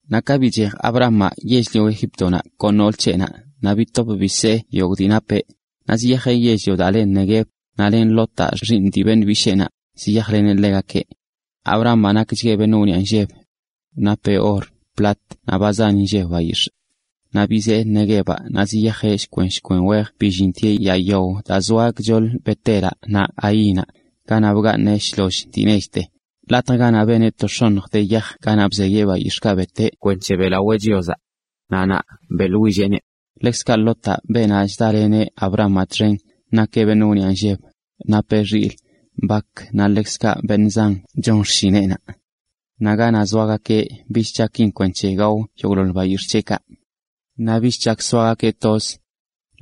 Naꞌ ka bichej Abramaꞌ yell-lio Egíptonaꞌ kon nool c̱heꞌnaꞌ naꞌ bitop bisee yogꞌ dii napeꞌ, naꞌ ziyajeꞌ yell-lio daa le Neguev, naꞌ len Lotaꞌ, xiiṉ dii beṉꞌ bisheenaꞌ, ziyajleneꞌ ḻegakeꞌ. Abramaꞌ nakchgueꞌ beṉꞌ wniꞌa nlleb. Napeꞌ or, plat naꞌ ba zan inlleb bayix̱ꞌ. Naꞌ bizee Neguevaꞌ naꞌ ziyajeꞌ shkwen shkwen wej billintieꞌ yaa yawaꞌ daa zoa gchoḻ Bet-elaꞌ naꞌ Hainaꞌ ganaꞌ bgaaṉeꞌ shloll dii nechte, latj ganaꞌ beneꞌ to x̱oṉj de yaj ganaꞌ bzeyeꞌ bayix̱ꞌkaꞌ beteꞌ kwenc̱he beꞌlawee X̱ancho Chiozaꞌ. Naꞌ naꞌ beꞌḻwilleꞌneꞌ. Ḻekzkaꞌ Lotaꞌ, beenaꞌ chdaleneꞌ Abramaꞌ txen, nakeꞌ beṉꞌ wniꞌa nlleb, napeꞌ xilꞌ, bak, naꞌ ḻekzkaꞌ beṉꞌ zan chon xshineꞌnaꞌ. Naꞌ ganaꞌ zoagakeꞌ bich chakin kwenc̱he gao yogꞌḻoḻ bayix̱ꞌ c̱heꞌkaꞌ. Naꞌ bich chak soagakeꞌ toz.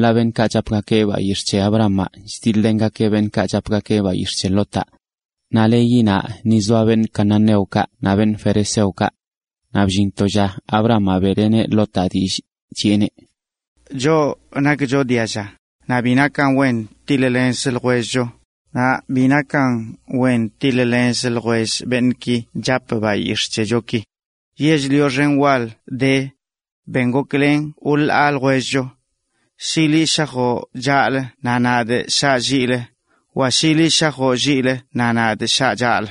Ḻaꞌ beṉꞌkaꞌ chapgakeꞌ bayix̱ꞌ c̱he Abramaꞌ chdiḻ-lengakeꞌ beṉꞌkaꞌ chapgakeꞌ bayix̱ꞌ c̱he Lotaꞌ. Naꞌ leyi naꞌ ni zoa cananeokaꞌ naꞌ ferezeokaꞌ. Naꞌ bllin to lla Abramaꞌ beꞌleneꞌ Lotaꞌ dillꞌ, chiꞌeneꞌ: “Choꞌ nakcho dialla, naꞌ bi nakan wen tiḻ-lenzə ljwellcho, naꞌ ni bi nakan wen tiḻ-lenzə ljwell beṉꞌki chap bayix̱ꞌ c̱hechoki. Yell-lio xen wal de. Ben goklen wḻaa ljwellcho. Shi liꞌ shajoꞌ chaꞌlə naꞌ nadꞌ shaꞌ lliꞌlə, wa shi liꞌ shajoꞌ lliꞌlə naꞌ nadꞌ shaꞌ chaꞌlə.”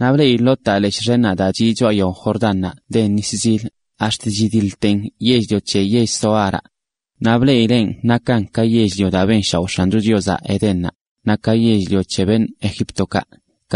Naꞌ bleꞌi Lotaꞌ leshꞌ xennaꞌ daa chiꞌ choꞌa yao Jordánnaꞌ den nis zil, ax̱t chidiḻten yell-lio c̱he yell Zoaraꞌ. Naꞌ bleꞌileꞌn nakan ka yell-lio daa benshaoꞌ X̱ancho Chiozaꞌ Edénnaꞌ, naꞌ ka yell-lio c̱he beṉꞌ Egíptokaꞌ.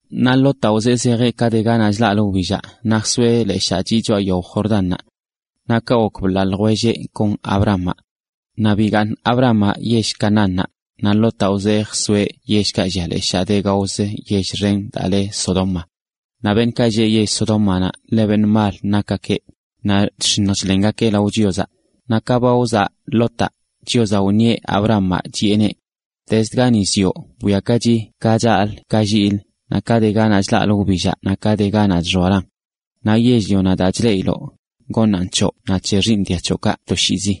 Naꞌ Lotaꞌ wzee zejeꞌ ka de ganaꞌ chlaꞌlə wbillaꞌ naꞌ jsoeꞌ leshaa chiꞌ choꞌa yao Jordánnaꞌ. Naꞌ kaꞌ gok bḻaa ljwelleꞌ kon Abramaꞌ. Naꞌ bigaaṉ Abramaꞌ yell-lio Canaánnaꞌ, naꞌ Lotaꞌ wzee jsoeꞌ yellkaꞌ llia leshaa de gaozə yell xen daa le Sodoma. Naꞌ beṉꞌkaꞌ lleꞌ yell Sodómanaꞌ ḻe beṉꞌ mal nakgakeꞌ, naꞌ chx̱iṉj chḻengakeꞌ lao Chiozaꞌ. Naꞌ ka ba wzaꞌ Lotaꞌ, Chiozaꞌ wṉieꞌ Abramaꞌ, chiꞌeneꞌ: “Gani zioꞌ bwiakachi ka chaꞌlə ka lliꞌlə, naꞌ ka de ganaꞌ chlaꞌlə wbillaꞌ naꞌ ka de ganaꞌ chxoalan. Naꞌ yell-lionaꞌ daa chleꞌiloꞌ, goṉaꞌn c̱hoꞌ naꞌ c̱he xiiṉ dia c̱hoꞌkaꞌ toshiizi.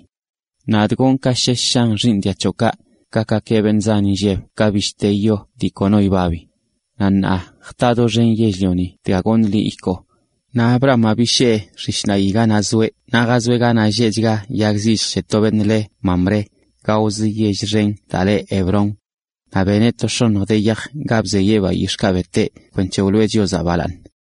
Nadꞌ gonꞌ ka shesh shan xiiṉ dia c̱hoꞌkaꞌ, gakgakeꞌ beṉꞌ zan inlleb ka bishte yonaꞌ daa kono yibabi. Naꞌ ṉaa jta doxen yell-lioni dga goṉꞌ liꞌ ikoo.” Naꞌ Abramaꞌ bishee xishṉaꞌyi ganaꞌ zoeꞌ naꞌ jazoeꞌ ganaꞌ ḻe lleꞌchga yag zilljə c̱he to beṉꞌ le Mamré, gaozə yell xen daa le Hebrón. Naꞌ beneꞌ to x̱oṉj de yaj ga bzeyeꞌ bayix̱ꞌkaꞌ beteꞌ kwenc̱he beꞌlawee Chiozaꞌ.